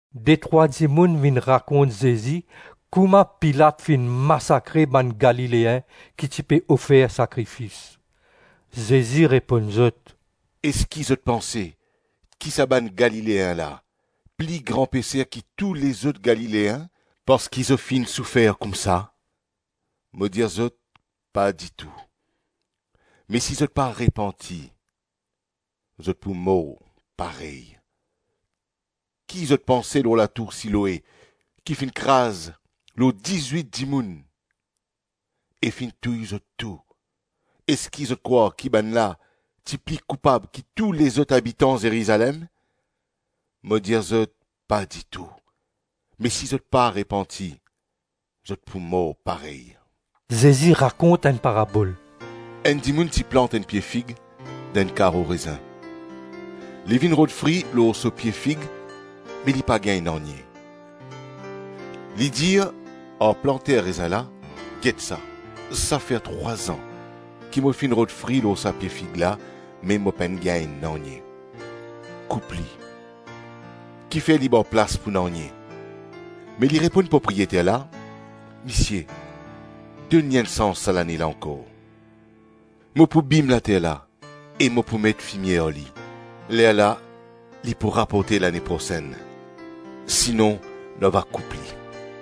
Detrwa dimoun vinn rakont Zezi kouma Pilat finn masakre bann Galileen ki ti pe ofer sakrifis. Zezi reponn zot, “Eski zot panse ki sa bann Galileen la pli gran peser ki tou lezot Galileen parski zot finn soufer koumsa? Mo dir zot, pa ditou! Me si zot pa repanti, zot pou mor parey. Ki zot panse lor latour Siloe ki finn kraz lor dizwit dimoun e finn touy zot tou? Eski zot krwar ki bannla ti pli koupab ki tou lezot abitan Zerizalem? Mo dir zot, pa ditou! Me si zot pa repanti, zot pou mor parey. Zezi rakont enn parabol, “Enn dimoun ti plant enn pie fig dan enn karo rezin. Li vinn rod fri lor so pie fig me li pa gagn nanye. Li dir ar planter rezin la, ‘Get sa, sa fer trwa-zan ki mo finn rod fri lor sa pie fig la me mo pa gagn nanye. Koup li. Kifer li bar plas pou nanye?’ Me li reponn propriyeter la, ‘Misie, donn li enn sans sa lane la ankor. Mo pou bim later la e mo pou met fimie ar li. Lerla li pou raporte lane prosenn. Sinon nou ava koup li.’”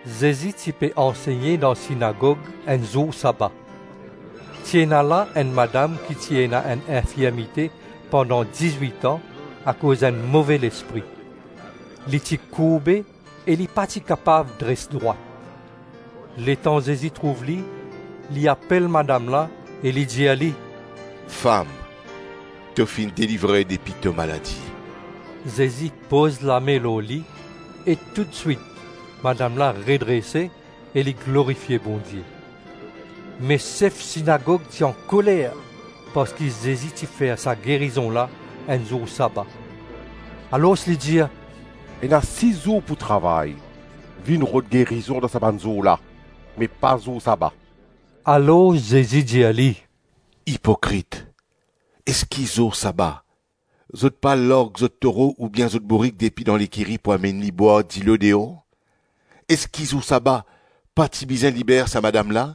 Zezi ti pe ansegne dan sinagog enn zour saba. Ti ena la, enn madam ki ti ena enn infirmite pandan dizwit-an akoz enn move lespri. Li ti kourbe e li pa ti kapav dres drwat. Letan Zezi trouv li, li apel madam la e li dir li, “Fam, to finn delivre depi to maladi.” Zezi poz lame lor li, e toutswit madam la redrese e li glorifie Bondie. Me sef sinagog ti ankoler parski Zezi ti fer sa gerizon la enn zour saba. Alors li dir, “Ena sis zour pou travay; vinn rod gerizon dan sa bann zour la, me pa zour saba.” Alor Zezi dir li, “Ipokrit! Eski zour saba, zot pa larg zot toro oubien zot bourik depi dan lekiri pou amenn li bwar dilo deor? Eski zour saba, pa ti bizin liber sa madam la,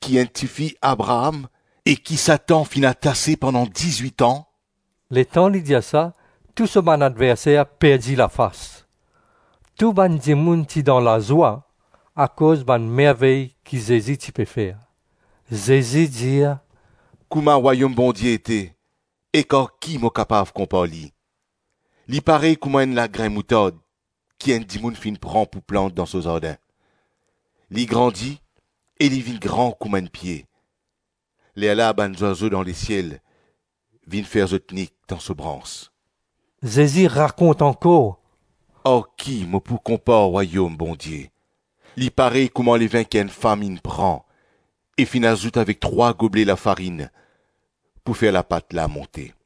ki enn tifi Abraam, e ki Satan finn atase pandan dizwit-an?” Letan li dir sa, tou so bann adverser perdi lafas. Tou bann dimoun ti dan lazwa akoz bann mervey ki Zezi ti pe fer. Zezi dir, “Kouma Rwayom Bondie ete, ek ar ki mo kapav konpar li? Li parey kouma enn lagrin moutard ki enn dimoun finn pran pou plant dan so zardin. Li grandi e li vinn gran kouma enn pie. Lerla bann zwazo dan lesiel vinn fer zot nik dan so brans.” Zezi rakont ankor, “Ar ki mo pou konpar Rwayom Bondie? Li parey kouma levin ki enn fam inn pran e finn azout avek trwa goble lafarinn pou fer lapat la monte.”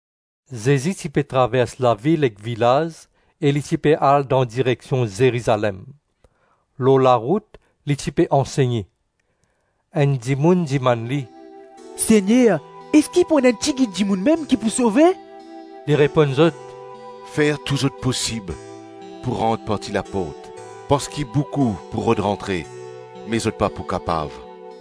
Zezi ti pe travers lavil ek vilaz e li ti pe al dan direksion Zerizalem. Lor larout li ti pe ansegne. Enn dimoun dimann li, “Segner eski pou ena enn tigit dimoun mem ki pou sove?” Li reponn zot, “Fer tou zot posib pou rant par ti laport parski boukou pou rod rantre me zot pa pou kapav.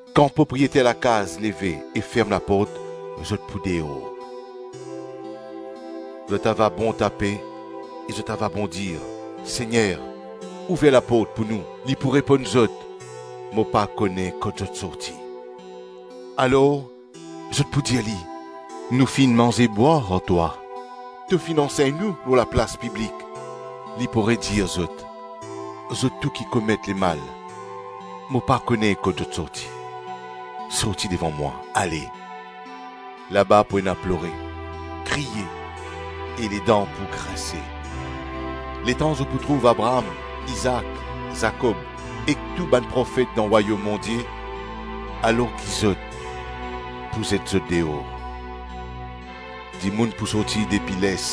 Kan propriyeter lakaz leve e ferm laport, zot pou deor. Zot ava bon tape e zot ava bon dir, ‘Segner, ouver laport pou nou,’ li pou reponn zot, ‘Mo pa kone kot zot sorti.’ Alors, zot pou dir li, ‘Nou finn manze-bwar ar twa; to finn ansegn nou lor laplas piblik.’ Li pou redir zot, ‘Zot tou ki komet lemal, mo pa kone kot zot sorti. Sorti devan mwa ale.’ Laba pou ena plore, kriye, e ledan pou grinse, letan zot pou trouv Abraam, Izaak, Zakob ek tou bann profet dan Rwayom Bondie alor ki zot, pou zet zot deor. Dimoun pou sorti depi les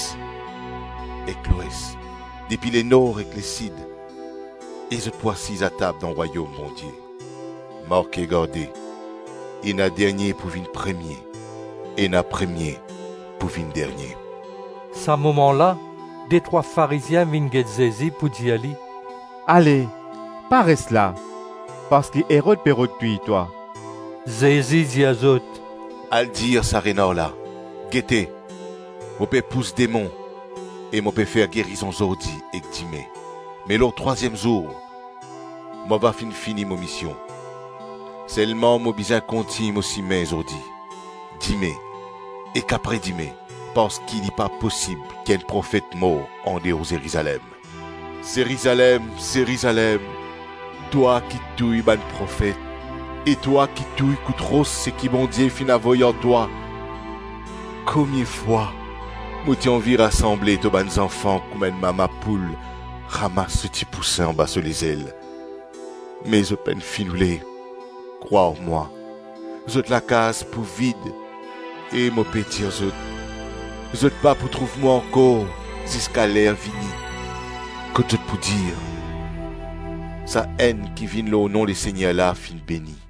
ek lwes, depi lenor ek lesid, e zot pou asiz atab dan Rwayom Bondie. Marke garde, ena dernie pou vinn premie, ena premie pou vinn dernie.” Sa moman la, detrwa Farizien vinn get Zezi pou dir li, “Ale pa res la, parski Erod pe rod touy twa.” Zezi dir zot, “Al dir sa renar la, ‘Gete, mo pe pous demon e mo pe fer gerizon zordi ek dime, me lor trwaziem zour, mo ava finn fini mo mision. Selman mo bizin kontign mo sime zordi, dime ek apre dime, parski li pa posib ki enn profet mor andeor Zerizalem.’ Zerizalem, Zerizalem, twa ki touy bann profet e twa ki touy kout ros seki Bondie finn avoy ar twa, komie fwa mo ti anvi rasanble to bann zanfan kouma enn mama poul ramas so tipousin anba so lezel, me zot pa finn oule! Krwar mwa, zot lakaz pou vid e mo pe dir zot, zot pa pou trouv mwa ankor ziska ler vini kot zot pou dir, ‘Sa-Enn ki vinn lor nom Lesegner la finn beni.’”